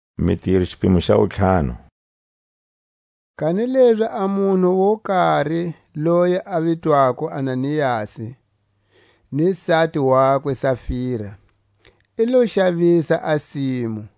Ananiasi na Safira. Kanilezi a munhu wo kari loyi a vitwako Ananiasi, ni sati wakwe Safira, i lo xavisa a simu,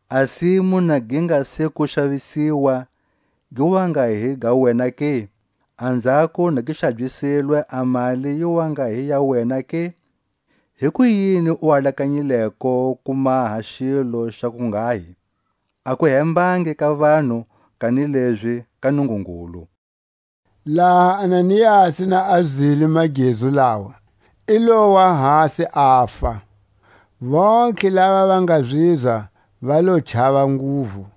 A simu na gi nga se ku xavisiwa, gi wa nga hi ga wena ke? Anzhako na gi xabyisilwe a mali yi wa nga hi ya wena ke? Hikuyini u alakanyileko ku maha xilo xa kunghahi? A ku hembangi ka vanhu, kanilezi ka Nungungulu. Laha Ananiasi na a zwile magezu lawa i lowa hasi afa; vontlhe lava va nga zizwa va lo chava nguvu.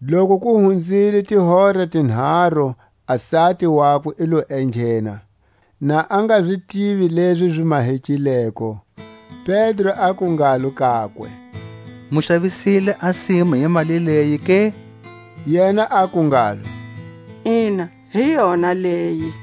Loku ku hunzile tihora tinharu a sati wakwe i lo enghena, na a nga zi tivi lezi zi mahekileko. Pedro aku ngalo kakwe: Mu xavisile a simu hi mali leyi ke? Yena aku ngalo: Ina, hi yona leyi.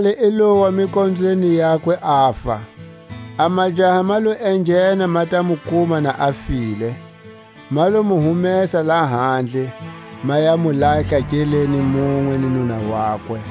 Khalakale i lowa mikonzweni yakwe, afa. A majaha ma lo enghena ma ta mu kuma na a file; ma lo mu humesa lahandle, ma ya mu lahla nkele munwe ni nuna wakwe.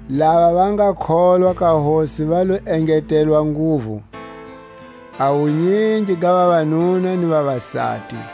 Lava va nga kholwa ka Hosi va lo engetelwa nguvu, a wunyingi ga vavanuna ni vavasati;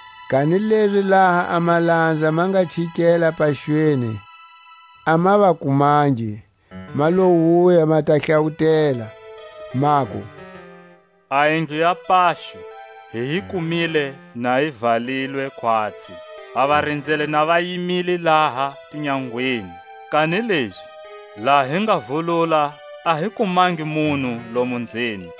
Kanilezi laha a malanza ma nga chikela paxweni, a ma va kumangi; ma lo wuya, ma ta hlawutela, maku: A yindlu ya paxo hi yi kumile na yi valilwe khwatsi, a varinzeli na va yimile laha tinyangweni; kanilezi laha hi nga vulula a hi kumangi munhu lomo nzeni.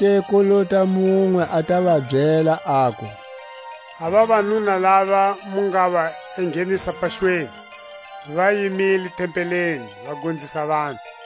Zonake ku lota munwe a ta va byela, aku: A vavanuna lava mu nga va enghenisa paxweni, va yimile tempeleni va gonzisa vanhu.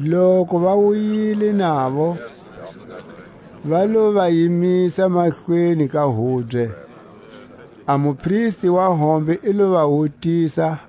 Loku va wuyile navo, va lo va yimisa mahlweni ka hubye. A mupristi wa hombe i lo va wutisa,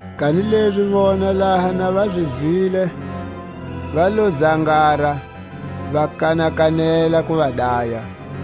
Kanilezi vona laha na va zi zwile, va lo zangara, va kanakanela ku va daya.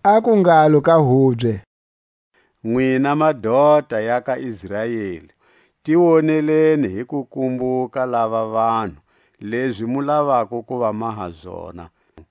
Aku ngalo ka hubye: Nwina madota ya ka Israeli, ti woneleni hi ku kumbuka lava vanhu, lezi mu lavako ku va maha zona.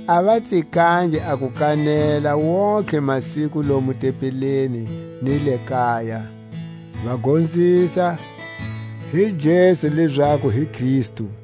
A va tsikangi a ku kanela wontihe masiku lomu tempeleni ni le kaya, va gonzisa hi Jesu lezaku hi Kristu.